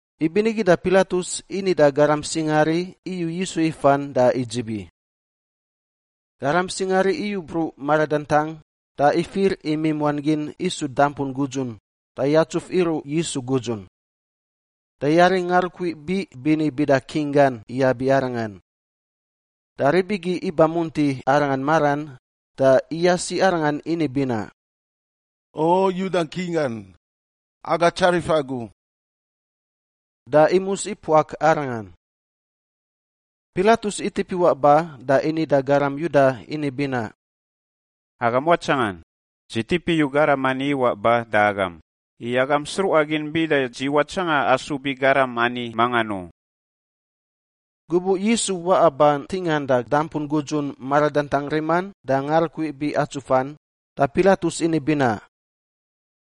Ibinigi da Pilatus ini da garam singaari iyu Yisu ifan da idzibi. Garam singaari iyu bruꞌ maradantang da ifir imimuan gin isu dampun gudzun da yatsuf iruꞌ Yisu gudzun. Da yari ngarukui biꞌ bini bida king gan iyab i Arangan. Da rib igi iba munti Arangan maran da iyasi Arangan ini binaꞌ, “O Yuda King gan! Aga tsarif agu.” Da imus ipuak Arangan. Pilatus itip iwaꞌ ba da ini da garam Yuda ini binaꞌ, “Agam watsangan! Dzi tip iyu garam ani iwaꞌ ba da agam, i agam sruꞌa gin bida dzi watsanga asub i garam ani mangan u.” Gubuꞌ Yisu waꞌa ba ntingan da dampun gudzun maradantang riman da ngarukui biꞌ atsufan, da Pilatus ini binaꞌ,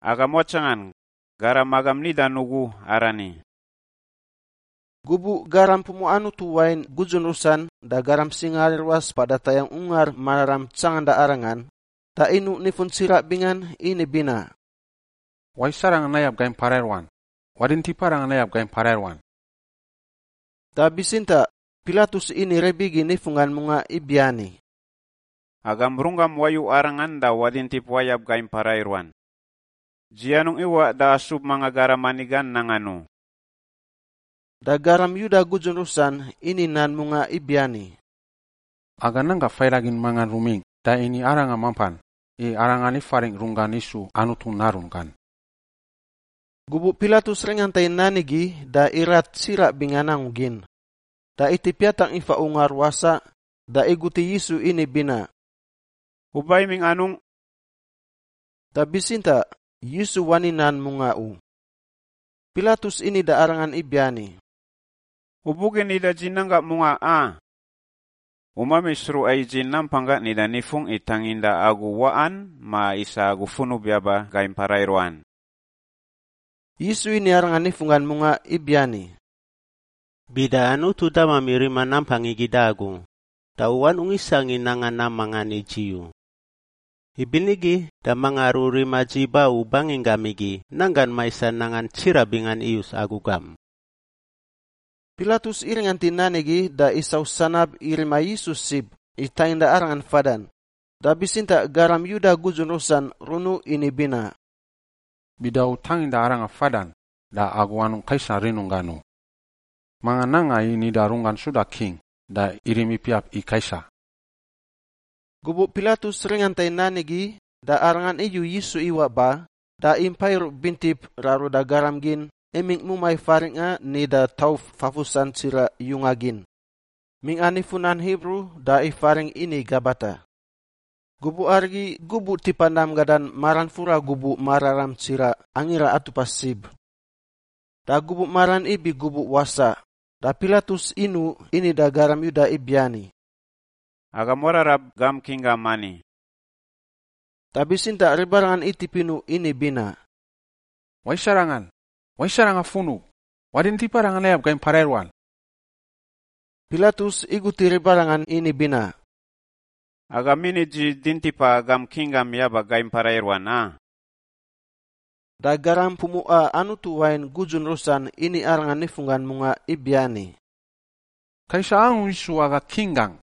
“Agam watsangan! Garam agam nidan ugu arani!” Gubuꞌ garam pumuꞌa Anutu wain gudzun rusan da garam singaari ruas mpada tayangꞌ Ungar Mararam tsanganda Arangan, da inuꞌ nifun tsiraꞌ bingan ini binaꞌ, “Wais arangan nayab gai mpara i ruan! Wadintip arangan nayab gai mpara i ruan!” Da bitsintaꞌ Pilatus ini rib igi nifunggan mungaꞌ ibiani, “Agam runggam wayu arangan da wadintip wayab gai mpara i ruan! Dzi anungꞌ iwaꞌ da asub mangan garam ani gan nangan u.” Da garam Yuda gudzun rusan ini nan mungaꞌ ibiani, “Aga nan gangꞌ faidagin mangan rumingꞌ da ini arangan mampan, i arangan ifaringꞌ runggan isu Anutu Narunggan.” Gubuꞌ Pilatus ringanta i nan igi da irat tsiraꞌ bingan angu gin, da itip yatangꞌ ifa ungar wasaꞌ da igut i Yisu ini binaꞌ, “U ba imingꞌ anungꞌ?” Da bitsintaꞌ Yisu wani nan mungaꞌ u. Pilatus ini da Arangan ibiani, “U bugin nida dzi nan gangꞌ mungaꞌ, a? U mami sruꞌa i dzi nampanggangꞌ nida nifungꞌ i tanginda agu waꞌan ma isa agu funub yaba gai mpara i ruan?” Yisu ini arangan nifunggan mungaꞌ ibiani, “Bida Anutu damami rima nampang igi da agu, da u anungꞌ isangꞌ i nanga nam mangan i dzi u. Ibinigi da manga aru rima dzi ba u banginggam igi nanggan maisan nangan tsiraꞌ bingan iyus agu gam.” Pilatus iringant i nan igi da isau sanab i rima Yisu sib i tanginda Arangan fadan, da bitsintaꞌ garam Yuda gudzun rusan runuꞌ ini binaꞌ, “Bida u tanginda arangan fadan da agu anungꞌ Kaisar rinunggan u! Manga nanga i nida runggan suda king, da irim ipiap i Kaisar.” Gubuꞌ Pilatus ringanta i nan igi da arangan iyu Yisu iwaꞌ ba da impa iruꞌ bintip raruda garam gin imingꞌ mumai faringꞌa nida Tauf Fafusan Tsiraꞌ Yunga Gin; mingꞌa nifu nan Hibru da ifaringꞌ ini Gabata. Gubuꞌ arigi gubuꞌ tipa nam gadan maran fura gubuꞌ mararam tsiraꞌ Angira Atupa Sib. Da gubuꞌ maran ibi gubuꞌ wasaꞌ, da Pilatus inuꞌ ini da garam Yuda ibiani, “Agam wararab gam king gam ani.” Da bitsintaꞌ ribarangan itip inuꞌ ini binaꞌ, “Wais arangan! Wais arangan funub! Wadintip arangan nayab gai mpara i ruan!” Pilatus igut i ribarangan ini binaꞌ, “Agam ini dzi dintipa agam king gam yaba gai mpara i ruan, a?” Da garam pumuꞌa Anutu wain gudzun rusan ini arangan nifunggan mungaꞌ ibiani, “Kaisar angu isu aga king gangꞌ!”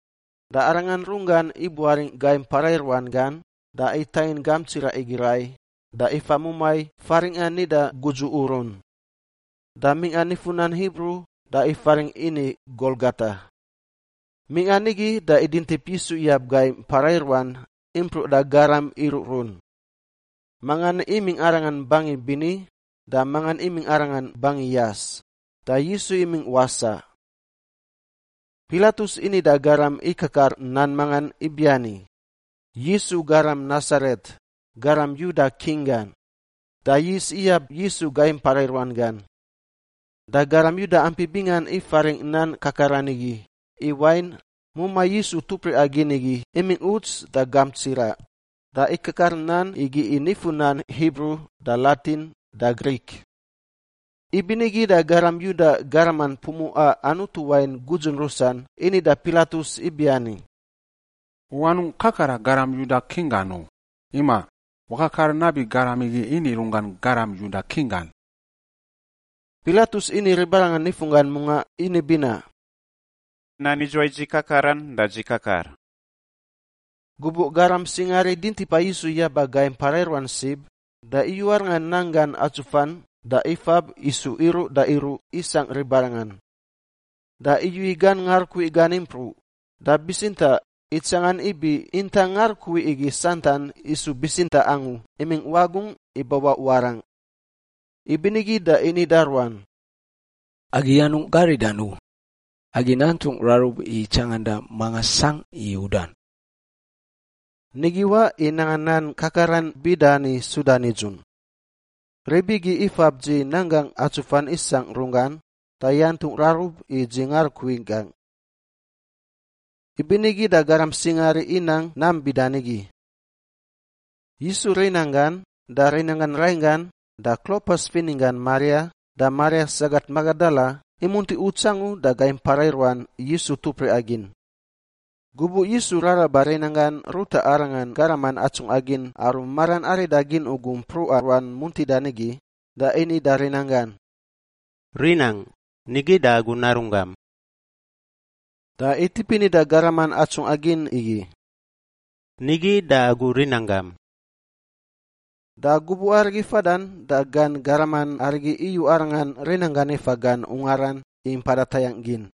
Da Arangan runggan ibuaringꞌ gai mpara i ruan gan da itangin gamp tsiraꞌ igi rai da ifa mumai faringꞌa nida Gudzu Urun. Da mingꞌa nifu nan Hibru da ifaringꞌ ini Golgota. Mingꞌa nigi da idintip Yisu iyab gai mpara i ruan impruꞌ da garam iruꞌrun. Mangan imingꞌ Arangan bangin bini da mangan imingꞌ Arangan bangi yas, da Yisu imingꞌ wasaꞌ. Pilatus ini da garam ikakar nan mangan ibiani, YISU, GARAM NASARET, GARAM YUDA KING GAN, da yis iyab Yisu gai mpara i ruan gan. Da garam Yuda ampi bingan ifaringꞌ nan kakaran igi, i wain, mumai Yisu tupriꞌa gin igi imingꞌ uts da gamp tsiraꞌ, da ikakar nan igi i nifu nan Hibru da Latin da Grik. Ibinigi da garam Yuda garaman pumuꞌa Anutu wain gudzun rusan ini da Pilatus ibiani, “U anungꞌ kakara, ‘Garam Yuda King gan’ u; imaꞌ, wakakar nabi garam igi ini runggan garam Yuda King gan.” Pilatus ini ribarangan nifunggan mungaꞌ ini binaꞌ, “Nam idzuwai dzi kakaran, da dzi kakar.” Gubuꞌ garam singaari dintipa Yisu yaba gai mpara i ruan sib, da iyu Arangan nanggan atsufan da ifab isu iruꞌ da iruꞌ isangꞌ ribarangan. Da iyu i gan ngarukui gan impruꞌ, da bitsintaꞌ itsangan ibi intang ngarukui igi santan isu bitsintaꞌ angu imingꞌ wagungꞌ ibawaꞌ warangꞌ. Ibinigi da ini da ruan, “Agi anungꞌ garidan u. Agi nantungꞌ rarub i tsanganda manga sangꞌ i udan.” Nigi waꞌ i nanga nan kakaran bida ani suda nidzun, “Rib igi ifab dzi nanggangꞌ atsufan isangꞌ runggan da yantungꞌ rarub i dzi ngarukui gangꞌ.” Ibinigi da garam singaari inang nam bida nigi. Yisu rinanggan da rinanggan rainggan da Klopas fininggan Maria da Maria sagat Magadala imunti uts angu da gai mpara i ruan Yisu tupriꞌa gin. Gubuꞌ Yisu raraba rinanggan ruta Arangan garaman atsungꞌa gin aru maran arida gin ugu mpruꞌa ruan muntida nigi, da ini da rinanggan, “Rinangꞌ, nigi da agu narunggam.” Da itip ini da garaman atsungꞌa gin igi, “Nigi da agu rinanggam.” Da gubuꞌ arigi fadan da gan garaman arigi iyu Arangan rinanggan ifa gan ungaran i mpada tayangꞌ gin.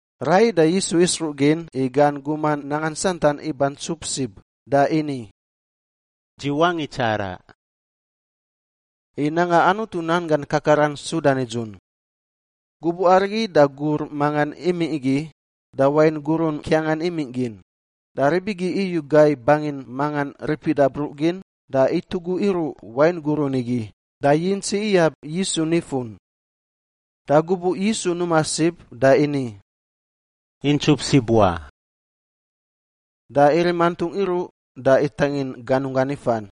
Raiyi da Yisu isruꞌ gin i gan guman nangan santan iba ntsup sib, da ini, “Dzi wangꞌ itsaraꞌ,” i nanga Anutu nan gan kakaran suda nidzun. Gubuꞌ arigi da gur mangan imingꞌ igi da wain gurun ngkiangan imingꞌ gin, da rib igi iyu gai bangin mangan ripida bruꞌ gin da itugu iruꞌ wain gurun igi da yintsi iyab Yisu nifun. Da gubuꞌ Yisu numa sib da ini, “Intsup sib wa.” Da irim antungꞌ iruꞌ da itangin ganunggan ifan.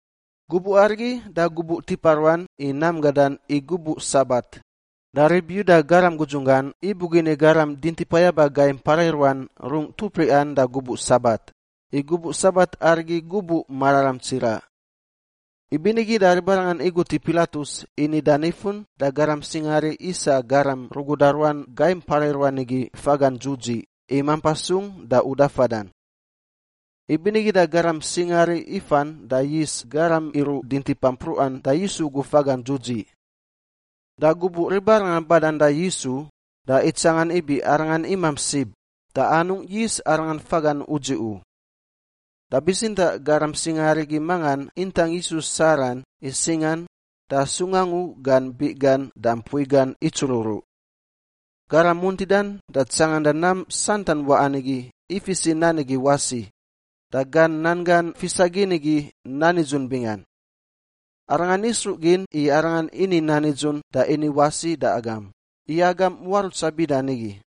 Gubuꞌ arigi da gubuꞌ tipa ruan i nam gadan i gubuꞌ Sabat, da rib Yuda garam gudzunggan ibugin i garam dintipa yaba gai mpara i ruan rungꞌ tupriꞌan da gubuꞌ Sabat, i gubuꞌ Sabat arigi gubuꞌ mararam tsiraꞌ. Ibinigi da ribarangan igut i Pilatus i nida nifun da garam singaari isa garam ruguda ruan gai mpara i ruan igi fagan dzudziꞌ i mampa sung da uda fadan. Ibinigi da garam singaari ifan da yis garam iruꞌ dintipa mpruꞌan da Yisu ugu fagan dzudziꞌ. Da gubuꞌ ribarangan badan da Yisu, da itsangan ibi Arangan imamp sib, da anungꞌ yis Arangan fagan udziꞌ u. Da bitsintaꞌ garam singaari igi mangan intang Yisu saran i singan da sung angu gan biꞌ gan da mpui gan itsururuꞌ. Garam muntidan da tsanganda nam santan waꞌan igi ifis i nan igi wasi, da gan nan gan fisa gin igi nan nidzun bingan. Arangan isruꞌ gin i arangan ini nan nidzun da ini wasi da agam, i agam muarutsa bida nigi.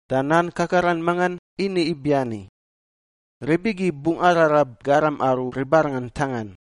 da nan kakaran mangan ini ibiani, “Rib igi bungꞌ ararab garam aru ribarangan ntangan.”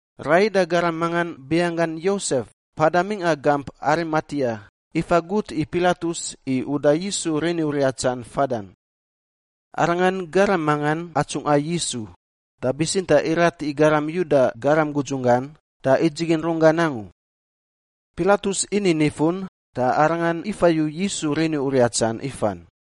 Raiyi da garam mangan binganggan Yosef, mpada mingꞌa gamp Arimatia ifa gut i Pilatus i uda Yisu rini uriatsan fadan. Arangan garam mangan atsungꞌa Yisu, da bitsintaꞌ irat i garam Yuda garam gudzunggan da idzigin runggan angu. Pilatus ini nifun, da arangan ifayu Yisu rini uriatsan ifan.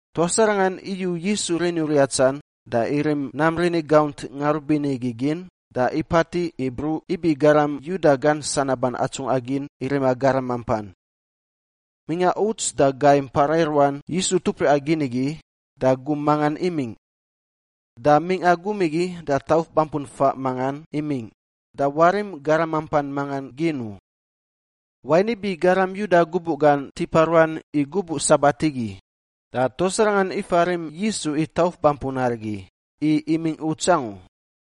Tuas arangan iyu Yisu rini uriatsan da irim nam rini gaunt ngarubini igi gin da ipatiꞌ i bruꞌ ibi garam Yuda gan sanaban atsungꞌa gin i rima garam mampan. Mingꞌa uts da gai mpara i ruan Yisu tupriꞌa gin igi, da gum mangan imingꞌ. Da mingꞌa gum igi da tauf bampun faꞌ mangan imingꞌ, da warim garam mampan manga gin u. Wain ibi garam Yuda gubuꞌ gan tipa ruan i gubuꞌ Sabat igi, da tuas arangan ifa rim Yisu i tauf bampun arigi, i imingꞌ uts angu.